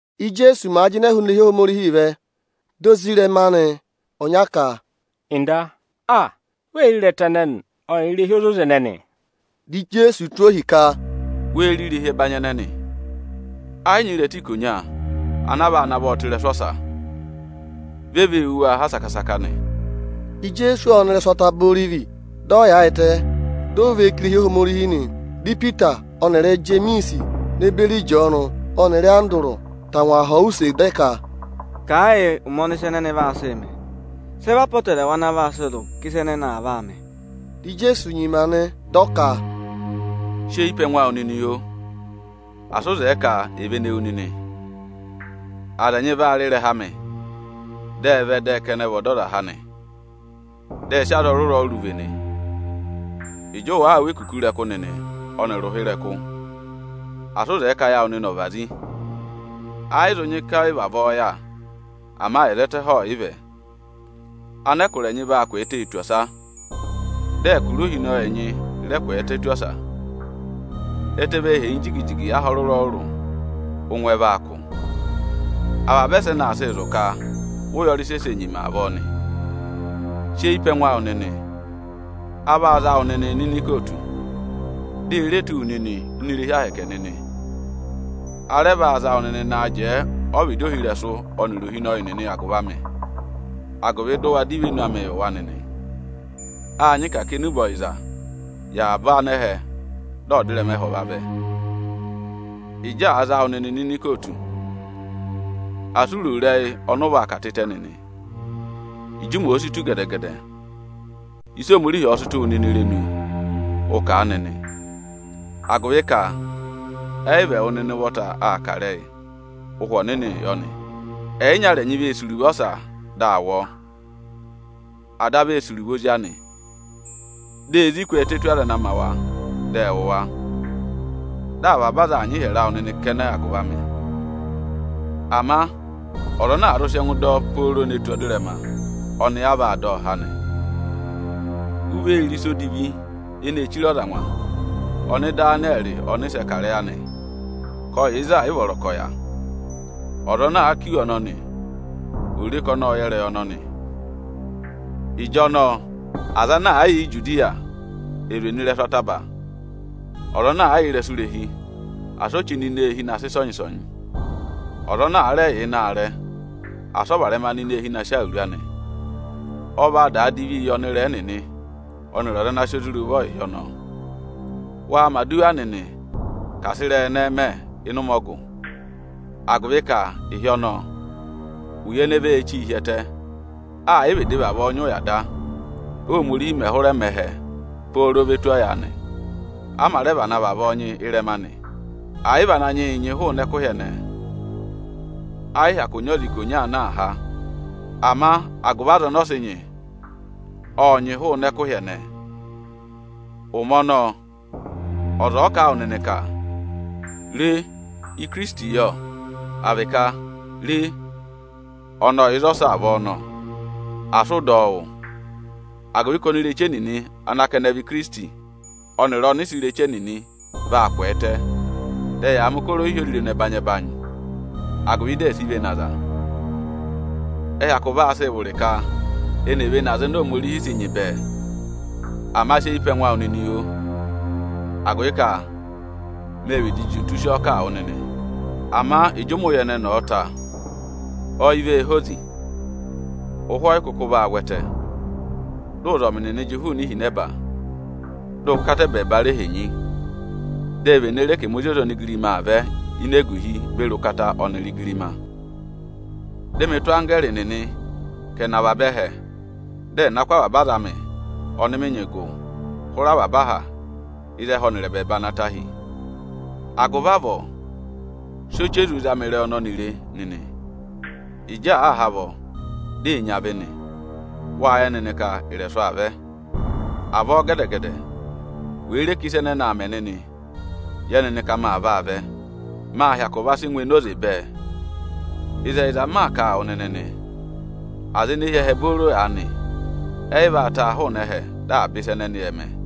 Íjeesu màa jịnẹ hụụnị irehi Ohomorihi vẹ, dị ozirẹma anị ọnya ka, “Nda, aa! Wee re ịrẹta ẹnẹnị ọnịrị irehi ozoza ẹnẹnị!” Dị Ijeesu tụ́ ohi ka, “Wee re irehi ẹbanyị ẹnẹnị? Ẹ yị nyị ịrẹta ikonya ana a vaa navọ tụ́ ịrẹsụ ọsa. Vị e vee wú wa ha saka-saka nị.” Ijeesu ộ nọ ịrẹsụ Ataba Orivi, dị ọ yaayịtẹ, dị ọ và eyi ká irehi Ohomorihi nị. Dị Ipita ọnịrị Ijemiisi ne beri Ịjọọnụ ọnịrị Andụrụ tangwa họ̀ ọ use, dị ẹ ka: “Kà ẹ yị ụmẹ ọnị ịsa ẹnẹnị vaa sị mẹ. Sị ẹ vị apọtẹrẹwa ana vaa sị zụ̀ ka ịsa ẹnẹnị aa vaa mẹ?” Dị Ijeesu nyima nị, dị ọ ka, “Sị eyi pe ẹngụ awụ nịnị, oo! Asị ụ zẹẹ ka è vene wu nịnị! Aza ẹnyị vaa rị ịrẹha amị, dị ẹ vẹ dị ẹ ka ẹnị ẹ vị Ọdọzaha nị, dị ẹ sị aza ọrụrụ-ọrụrụ vene. Ịjị ụ wàa wụ́ ekuku ịrẹkụ nịnị ọnịrị ụha ịrẹkụ, asị ụ zẹẹ ka ayị awụ nịnị ọ̀ vazi. Ẹ yị zụ nyị ka ọyị vavọọ yà; ama ẹzẹtẹ ẹhẹ ọọ̀ yị vẹ. Anẹkụra ẹnyị vaa kwẹẹtẹ tù ọsa, dị ẹkụra ohinọyị ẹnyị rẹ kwẹẹtẹ tù ọsa. Ẹtẹ vee henyi jigi-jigi aha ọrụrụ-ọrụrụ, ụngwẹ vaa kụ̀. Avaba ẹsẹnị aa sịị zụ̀ ka vị ụyọrị sẹsẹ nyima avọọ nị. Sị eyi pe ẹngụ awụ nịnị! A vaa za wụ nịnị nọ ini ikootu, di e re tụ́ wu nịnị ini irehi ahẹkẹ Aniju nịnị. A rẹ vaa za wụ nịnị naa jẹẹ ọvịdị ohirẹsụ ọnịrị ohinọyị nịnị agụvị amị, agụvị dị ụ wa dọ ivenu amị yị wa nịnị. Â nyị ka à kà enube ọyịza yị avaba anẹhẹ dị ọdịrẹma ẹhẹ ọ̀ vavẹ. Ịjị àa za wụ nịnị nọ ini ikootu, asị u ro ịrẹyị ọnị ụ vaa kà tịtẹ nịnị! Ịjị ụmẹ òo si tù gẹdẹ-gẹdẹ, ịsị Ohomorihi ọ̀ọ sị tụ́ wụ nịnị irenu, ụ kà a nịnị; agụvị ka ẹ yị vị ẹwụ nịnị ụvọta aa kà ịrẹyị, Ụhwẹ Ọnịnịị yọ nị. Ẹyịnyara ẹnyị vee sì iruvo ọsa, dị a wụ ọọ. Ada vee sì iruvo ozi anị. Di ezi kwẹẹtẹ tù aza ana ma wa, dị ẹ wụ̀ wa. Dị avaba aza aa nyị ịhyẹrẹ awụ nịnị kẹnẹ agụvị amị. Ama, ọza ana àa zụ sị ẹngụ dọ ọ pooro ne tù ọdịrẹma, ọnị a vaa dọ ọ há nị. U vee re ‘Ịsa Odivi eneē chire ọza angwa’ (ọnị Ịdanịyẹrị ọnịsẹ kà ịrẹyị anị) ka ọ yà ịzị ẹ̀ yị vọrọ ka ọ̀ yà. (Ọza ana aa kà iwe ọnọnị, ò re ka ọnị ộ yẹ ịrẹyị ọnọnị!) Ịjọnọọ aza ana àa yà Ijudiya è zwe nọ ịrẹsụ ataba. Ọza ana àa yà ịrẹsụ irehi, asị o chí nọ ini eehi na sị ịsọnyị-ịsọnyị! Ọza ana àa rẹ yà ịnị aarẹ, asị ọ varẹma nọ ini eehi na sị awuru anị! Ọ vaa daa divi yị ọnịrẹẹ nịnị ọnịrị aza ana sị ozi rị ụvọ ịhị ọnọọ. Waa mẹ̀ aduwa nịnị, ka asị ịrẹyị ẹnẹẹ mẹ ịnị ụmẹ ọgụ, agụvị ka ịhị ọnọọ, ụya ene vee chí hi ẹtẹ, ẹ̀ yị vịdị vavọọ nyị ụya da, Óhomorihi mẹ̀ hụrẹ mẹ ẹhẹ pooro ve tù ọyaanị; a mā rẹ vana vavọọ nyị ị́rẹma anị. Ẹ̀ yị vị Ananyị yị nyị hụụnị ẹkụhị ẹnẹẹ, ẹ yị hyakụ nyị ọza ikonya ana aa há. Ama agụvị aza ọnọọ sị nyị, ộ nyị hụụnị ẹkụhị ẹnẹẹ. Ụmẹ ọnọọ, ọza ọ̀ọ ka a wụ nịnị ka: ‘Re, Ikirisiti yọ’ à vị ka: ‘Re, ọnị ọ yà ịzọsọọ avọọ nọ’, asị ụ dọ ọ wụ́, agụvị ka onireche nịnị ana ka ẹnị vị Ikirisiti, ọnịrị ọnịsẹ ireche nịnị vaa kwẹẹtẹ, dị ẹyaa mẹ̀ ụkọrọ ohyozirenu ẹbanyị-ẹbanyị, agụvị di è si vene aza. Ẹ hyakụ vaa sịị vụrị ka eni è vene aza oni Ohomorihi sị nyị bẹẹ. Ama sị eyi pe ẹngụ awụ nịnị, oo, agụvị ka mê vịdị juntu sị ọọ kà a wụ nịnị! Ama ịjị ụmẹ ụya ẹnẹnị ọ̀ọ ta, ọyị vee hozi, ụhwẹ ọ yị kụkụ vaa vwẹtẹ, dị ụzọmị nịnị jị hụụnị ihinẹba, dị ụkata ẹbẹẹba re henyi. Di e vene re ka ẹmị Ozi ọza onigirima aa vẹ ini eguhi beri ụkata ọnịrị igirima. Dị mị tụ́ anggẹẹrị nịnị ka ẹ̀ nọ avaba ẹhẹ, dị ẹ̀ na kụ́ avaba aza amị ọnị mị nyị gụ hụrẹ avaba aha ịzị ẹhẹ ọnịrị ẹbẹẹba na ta hi. Agụvị avọọ, sị ọchị ezu zama ịrẹyị ọnọnị re nịnị; Ịjị àa ha avọ, di ee nyị avị nị, wâ yẹ nịnị ka ị̀rẹ̀sụ̀ aa vẹ. Avọọ gẹdẹ-gẹdẹ wèe re ka ịsa ẹnẹnị aa mẹ nịnị, yẹ nịnị ka maa vaa vẹ, mâ hyakụ va sị ngụ enoze bẹẹ. Ịzẹyịza m maa kà a wụ nịnị nị, aza ene hi ẹhẹ booro aanị, ẹ yị vaa taa hụụnị ẹhẹ dị avaba ịsa ẹnẹnị ẹ̀ mẹ.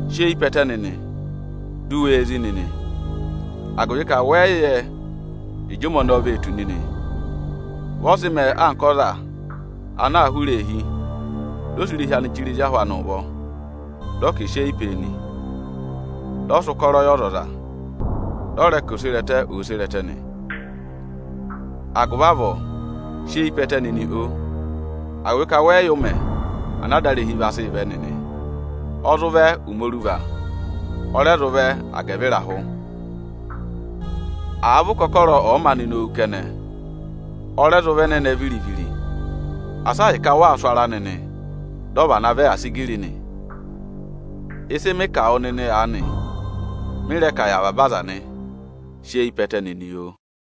Sị eyi pe ẹtẹ nịnị, di u wee zí nịnị, agụvị ka wẹ yị yẹ ịjị ụmẹ ọnọọ vee tù nịnị. Vị ọ sị mẹẹ anka ọza ana aa hụrẹ eehi, dị ọ sị irehi anị chire ezi ahụ anị ụvọ, dị ọ ka è sị eyi pee nị. Dị ọ sị ụkọrọ yị ọzọza, dị ọ rẹ ka oserẹtẹ òo sere ẹtẹ nị. Agụvị avọọ sị eyi pe ẹtẹ nịnị, oo, agụvị ka wẹ yị yẹ ụmẹ ana adarehi aa sịị vẹ nịnị. Ọ zụ vẹ ụmẹ oruva, ọ rẹ zụ vẹ agẹvịrahụ, àa vị ụkọkọrọ ọ̀ọ maanị nowu kẹnẹ, ọ rẹ zụ vị ẹnẹnẹ viri-viri. Asị ahịka ụ waa sụ ara nịnị, dị ọ vana vẹ asigiri nị. Ịsị mị kà wụ nịnị aanị, mị rẹ kà yị avaba aza nị: Sị eyi pe ẹtẹ nịnị, oo!”